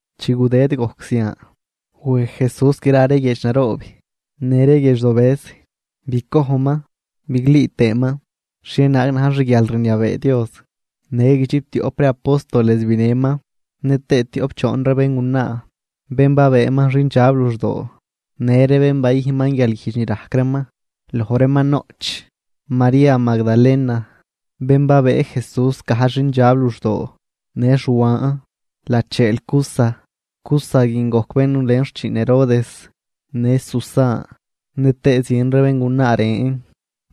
Chi gudëd gojc zian, wej Jesús gra ree guiedx naroob në ree guiedx dobëz bicojnman biglüü tëëman xhienaag na̱j xguialrniabee Dios. Në guidxiptioꞌp ree apóstoles binëman, nëtëë tioꞌp choon ree béngunaa, bén babëëman xindxab luxdoo, në ree bén bayüjnman guialguijdx ni rajc reeman. Loj reeman noꞌch María Magdalena, bén babëë Jesús gajdx xindxab luxdoo. Në Xuan, lacheel Cuza, Cuza guin goc bén nulen xchiin Herodes. Në Susan nëtëë zien ree béngunaa ren,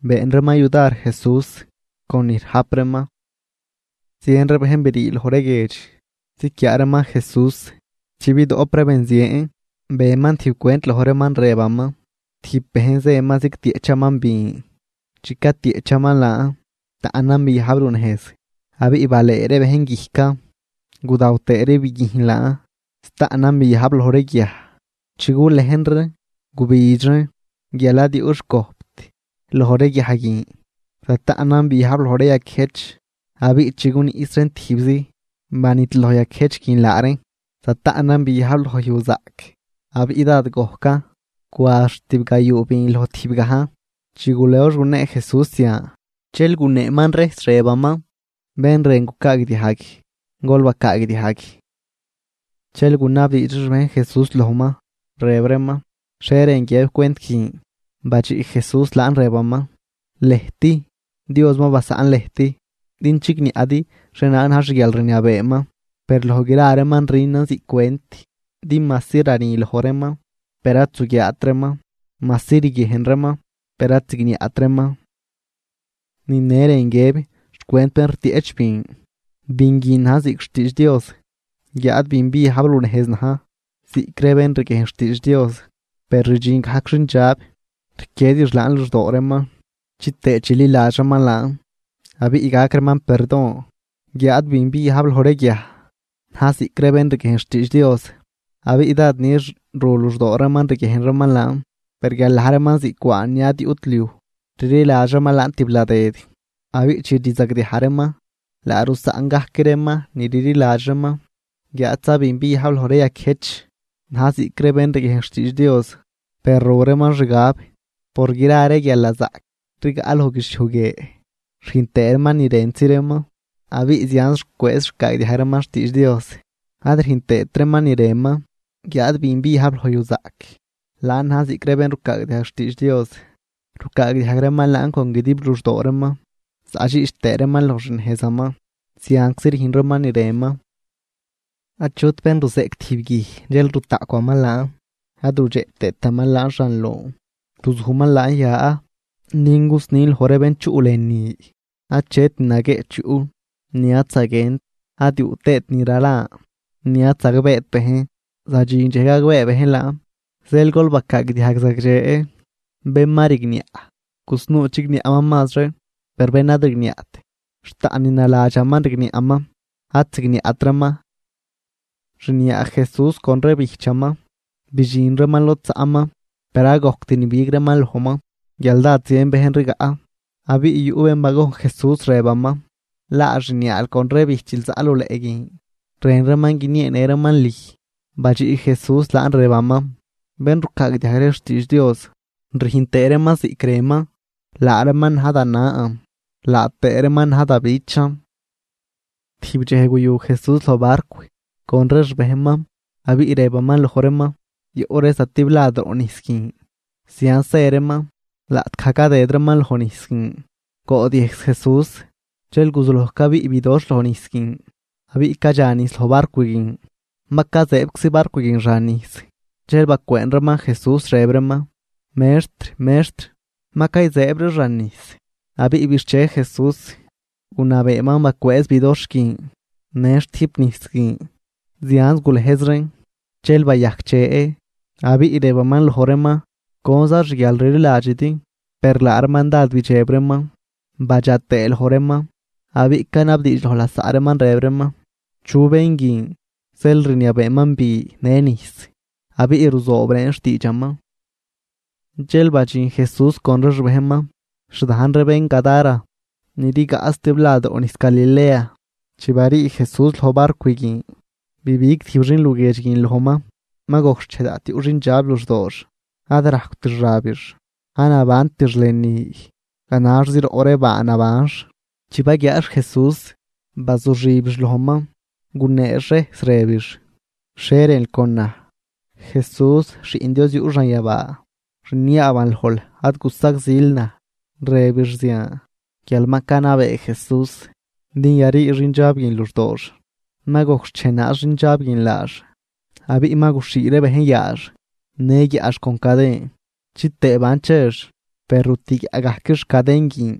been reeman yudar Jesús con ni rajp reeman. Zien ree bejn brii loj ree guiedx ziquiaa reeman Jesús. Chi bidoꞌp ree benzien, beman tijb cwent loj reeman rëbaman: ―Tijb bejn zëman zigtieꞌchaman bin. Chi catieꞌchaman laan, taꞌnan biajb lunejz abiꞌ balëë ree bejn guijcan gudaw tëë ree biguijn laan. Zataꞌnan biajb loj ree guiaj, chi gulejn reen gubidx reen guial ad yuꞌ xcojpt loj ree guiaj guin. Zataꞌnan biajb loj ree yaquiëjch. Abiꞌ chi guniꞌs reen tijbzi, banidloj yaquiëjch guin laa reen. Zataꞌnan biajb loj yujzaꞌc abiꞌ dád gojcan, cwa xt tibgayuu bin loj tijbgajn. Chi gulox gunee Jesús zian, dxel guneeman rejs rëbaman: ―Bén rën gucaagdiajg, gol bacaagdiajg. Dxel gunabdiidx ree xbejn Jesús lojman, rëb reeman: ―¿Xhie rën guiëb cwent guin? Badxiꞌ Jesús laan rëbaman: ―Lëjt, Dios ma basaꞌn lëjt din chigniaꞌdi xhienaag na̱j xguialrniabeeman. Per loj gra reeman rünan ziꞌc cwent din majsi rani loj reeman, per ad zuguiaat reeman, majsi riguiejn reeman, per ad zigniaꞌt reeman. ’Ni ne rën guiëb xcwent bén rtieꞌch bin: Bin guin na̱j ziꞌc xtiidx Dios, guiáad bin biajb runejz na̱j ziꞌc ree bén riguiejn xtiidx Dios; per rdxin gajc xindxab rquiedix laan luxdoo reeman chitëë chililadx reeman laan abiꞌ gac reeman perdon. Guiáad bin biajb loj ree guiaj, na̱j ziꞌc ree bén riguiejn xtiidx Dios, abiꞌ dád nix ru luxdoo reeman riguiejn reeman laan, per guial na̱j reeman ziꞌc cwaan ni ad yuꞌt liuj, rliladx reeman laan tibladëd abiꞌ chi rzagdiaj reeman laa rusaꞌn gajc reeman ni rliladx reeman. Guiáadza bin biajb loj ree yaquiëjch, na̱j ziꞌc ree bén riguiejn xtiidx Dios; per ru reeman xgab por gra ree guialnazaꞌc rigaꞌ loj guidxliuj guie rüjn tëë reeman ni rëntzi reeman, abiꞌ zianz rucwëëz rucaagdiajg reeman xtiidx Dios ad rüjn tëët reeman ni rënman. Guiáad bin biajb loj yujzaꞌc, laan na̱j ziꞌc ree bén rucaagdiajg xtiidx Dios, rucaagdiajg reeman laan con guidib luxdoo reeman zaꞌdxiꞌch tëë reeman loj xnejzaman, zianczi rüjn reeman ni rënman. ’Achut bén ruzeꞌc tijb guij dxel rutaꞌcwaman laan, ad rudxeꞌ tëëtaman laan xan lon, ruzujman laan ya din gusnin loj ree bén chuꞌ lënü. Achet ni naguieꞌch yuꞌ ni ad zaguient ad yuꞌ tëët ni ralan ni ad zagbeet bejn, zadxin dxej gagbee bejn laan. ’Zeel gol bacaagdiajg zagdxe, bén ma rigniaꞌ gusnuu chigniaꞌman mazri, per bén ad rigniaꞌt, xt taꞌn ni naladxaman rigniaꞌman ad zigniaꞌtraman. Xniaa Jesús con ree bijchaman bidxin reeman lod zaꞌman, per ad gojct nibig reeman lojman guial dád zien bejn rigaꞌ. Abiꞌ yuꞌ bén bagojn Jesús rëbaman: ―Laa xniaal con ree bijchil zaꞌ luleꞌ guin rën reeman guinieenë reeman lüj. Badxiꞌ Jesús laan rëbaman: ―Bén rucaagdiajg ree xtiidx Dios rüjn tëë reeman ziꞌc rënman, laa reeman na̱j da nan laa tëë reeman na̱j da bichan. Tijb dxej guyu Jesús loj barcw con ree xbejnman, abiꞌ rëbaman loj reeman: ―Yoꞌ ree zatiblad roꞌ nijs guin. Zianz zë reeman. Laꞌtgaj cadëd reeman loj nijs guin, goodyëjs Jesús. Dxel guzuloj cabiꞌ bidoxh loj nijs guin, abiꞌ cadxa nijs loj barcw guin, ma cazëëbczi barcw guin xan nijs. Dxel bacwëën reeman Jesús, rëb reeman: ―¡Mextr! ¡Mextr! ¡Ma cayzëëb ree xan nijs! Abiꞌ bixche Jesús gunabeeman bacwëëz bidoxh guin në xtüjp nijs guin, zianz gulëjz reen dxel bayajcdxe. Abiꞌ rëbaman loj reeman: ―¿Conza xguialrliladxidi? Per laa reeman dád bidxeb reeman badxa tëë loj reeman, abiꞌ canabdiidx loj lasaꞌ reeman rëb reeman: ―¿Chu bén guin zeel rniabeeman bi në nijs, abiꞌ ruzoob reen xtiidxaman? Dxel badxin Jesús con ree xbejnman xdajn ree bén Gadara, ni rigaꞌ zatiblad roꞌ nijs Galilea. Chi barii Jesús loj barcw guin, bibig tijb xin luguiedx guin lojman. Ma gojc xchej daꞌt yuꞌ xindxab luxdoox. Ad rajcwt xabix, ad nabantix lënü, ganaxzi roꞌ ree baa nabanx. Chi baguiaax Jesús bazuxibix lojman, guneex rejs rëbix: ―¿Xhie rënl con naj, Jesús, Xiꞌn Dios yuꞌ xanyabaa? Rniaaban lojl ad gusagzil naj. Rëbix zian guial ma canabee Jesús din yarii xindxab guin luxdoox. Ma gojc xchej naaz xindxab guin laax. Abiꞌ ma guxhii ree bejn yaax në guiaꞌx con caden chitëë ban chex, per rutüguiaꞌgajquix caden guin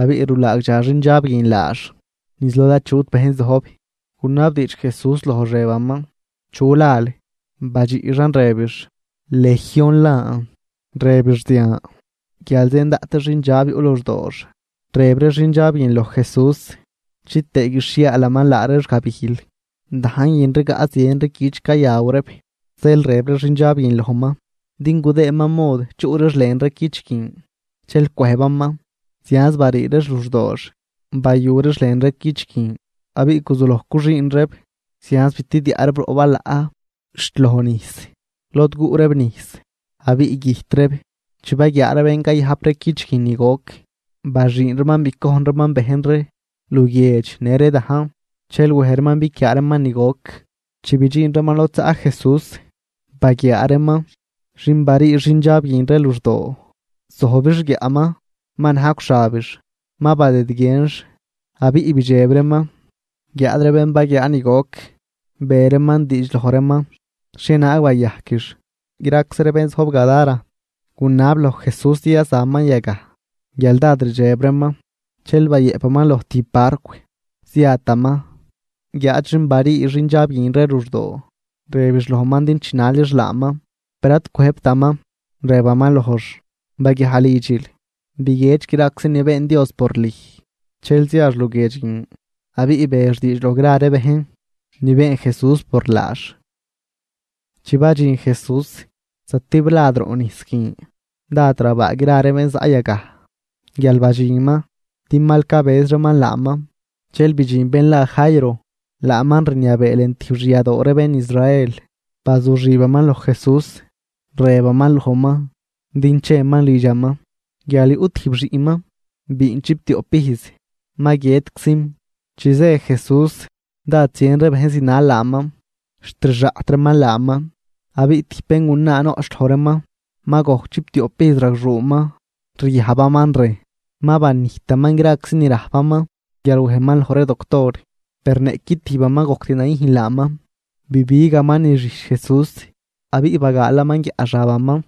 abiꞌ rulaagdxa xindxab guin laax niz lod achut bejn zojb. Gunabdiidx Jesús lojx rëbaman: ―¿Chu lal? Badxiꞌxan rëbix: ―Legión lan. Rëbix zian guial zien daꞌt ree xindxab yuꞌ luxdoox. Rëb ree xindxab guin loj Jesús chitëë guixhiaalaman laa reex gabijl. Dajn guin rigaꞌ zien ree cüch cayaw reeb. Zeel rëb ree xindxab guin lojman din gudëëman mod chuꞌ reex lën ree cüch guin, dxel cwëjbaman. Zianz barii reex luxdoox bayu reex lën ree cüch guin, abiꞌ guzuloj cuxüün reeb zianz bitidiaꞌ reeb roꞌ balaꞌ xt loj nijs, lod guꞌ reeb nijs abiꞌ güjt reeb. Chi baguiaa ree bén cayajp ree cüch guin ni goc, baxüün reeman bicojn reeman bejn ree luguiedx në ree dajn. Dxel wej reeman biquiaa reeman ni goc. Chi bidxin reeman lod zaꞌ Jesús, baguiaa reeman xin barii xindxab guin ree luxdoo, zojbix guiaꞌman ma najcw xabix, ma badëdguienx abiꞌ bidxeb reeman. Guiáad ree bén baguiaa ni goc, be reeman diidx loj reeman xhienaag bayajquix. Graczi ree bén zojb Gadara gunab loj Jesús din yazaman yagaj guial dád rdxeb reeman. Dxel bayëꞌpaman loj tijb barcw, ziataman. Guiáad xin barii xindxab guin ree luxdoo rëbix lojman din chinalix laaman, per ad cwëjbtaman, rëbaman lojx: ―Baguiaj lidxil, biguiedx graczi ni been Dios por lüj. Dxel ziax luguiedx guin abiꞌ bex diidx loj gra ree bejn ni been Jesús por laax. Chi badxin Jesús zatiblad roꞌ nijs guin, dád rabaa gra ree bén zaꞌ yagaj guial badxinman din mal cabëz reeman laaman. Dxel bidxin bén la Jairo, laaman rniabee lën tijb xyadoo ree bén Israel. Bazuxibaman loj Jesús, rëbaman lojman din cheman lidxaman, guial yuꞌ tijb xiꞌnman biin chiptioꞌp ijz, ma guiëtczim. Chi zë Jesús dád zien ree bejn zinal laaman xt rixaꞌt reeman laaman. Abiꞌ tijb béngunaa noꞌch loj reeman, ma gojc chiptioꞌp ijz ragxuuman ryajbaman rejn. Ma banijtaman graczi ni rajpaman guial wejman loj ree doctor, per niꞌqui tijbaman ad gojct nayüjn laaman. Bibigaman niz xijch Jesús abiꞌ bagaalaman guiaꞌ xabaman.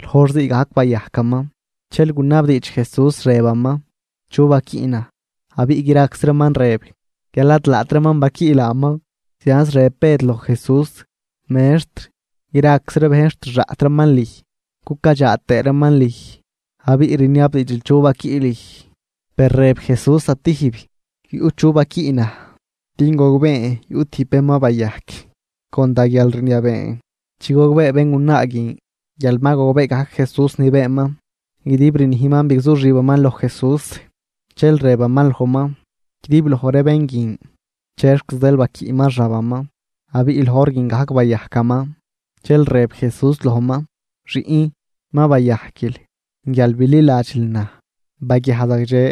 Loj hor ziigajc bayajcaman. Dxel gunabdiidx Jesús rëbaman: ―¿Chu baquiꞌ naj? Abiꞌ graczi reeman rëb guial ad laat reeman baquiꞌ laaman. Zianz rëb Bëd loj Jesús: ―Mextr, graczi ree bejn xt rixaꞌt reeman lüj cucadxaa tëë reeman lüj, abiꞌ rniabdiidxil chu baquiꞌ lüj. Per rëb Jesús zatijb: ―Yuꞌ chu baquiꞌ naj din gogbeen yuꞌ tijb bén ma bayajc con da guialrniabeen. Chi gogbee béngunaa guin guial ma gogbee gajc Jesús ni beenman, guidib rnijman bigzuxibaman loj Jesús. Dxel rëbaman lojman guidibloj ree bén guin chexc zeel baquiꞌman xabaman abiꞌ loj hor guin gajc bayajcaman. Dxel rëb Jesús lojman: ―Xiꞌn, ma bayajquil guial bililadxil naj, baguiaj zagdxe.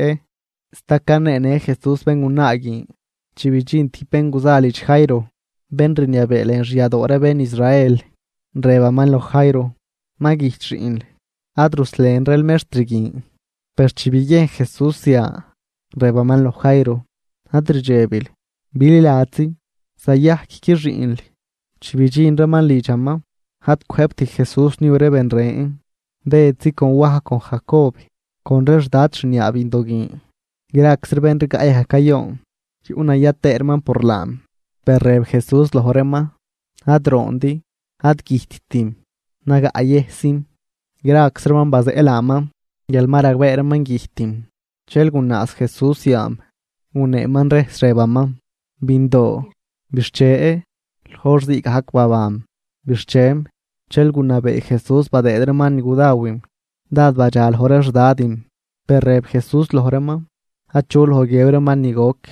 Sta caneenë Jesús béngunaa guin, chi bidxin tijb bén guza lidx Jairo, bén rniabee lën xyadoo ree bén Israel, rëbaman loj Jairo: ―Mal güjt xiꞌnl, ad ruslenril Mextr guin. Per chi biguiejn Jesús zian, rëbaman loj Jairo: ―Ad rdxebil, bililadxzi, zayajcqui xiꞌnl. Chi bidxin reeman lidxaman, ad cwëjbt Jesús niu ree ben ren, Bëdzi con Waj, con Jacob, con ree xdad xniaa bindo guin. Graczi ree bén rigaꞌ yagaj cayoon, yuꞌnaya tëë reeman por laam. Per rëb Jesús loj reeman: ―Ad roondi, ad güjttim, nagaꞌyëjszim. Graczi reeman bazeꞌ laaman guial ma ragbee reeman güjtim. Dxel gunaaz Jesús yaam, guneeman rejs, rëbaman: ―Bindoo, bixche. Loj hor ziigajc babanm, bixchem. Dxel gunabee Jesús badëëd reeman ni gudawim. Dád badxa loj ree xdadim, per rëb Jesús loj reeman achu loj guiëb reeman ni goc.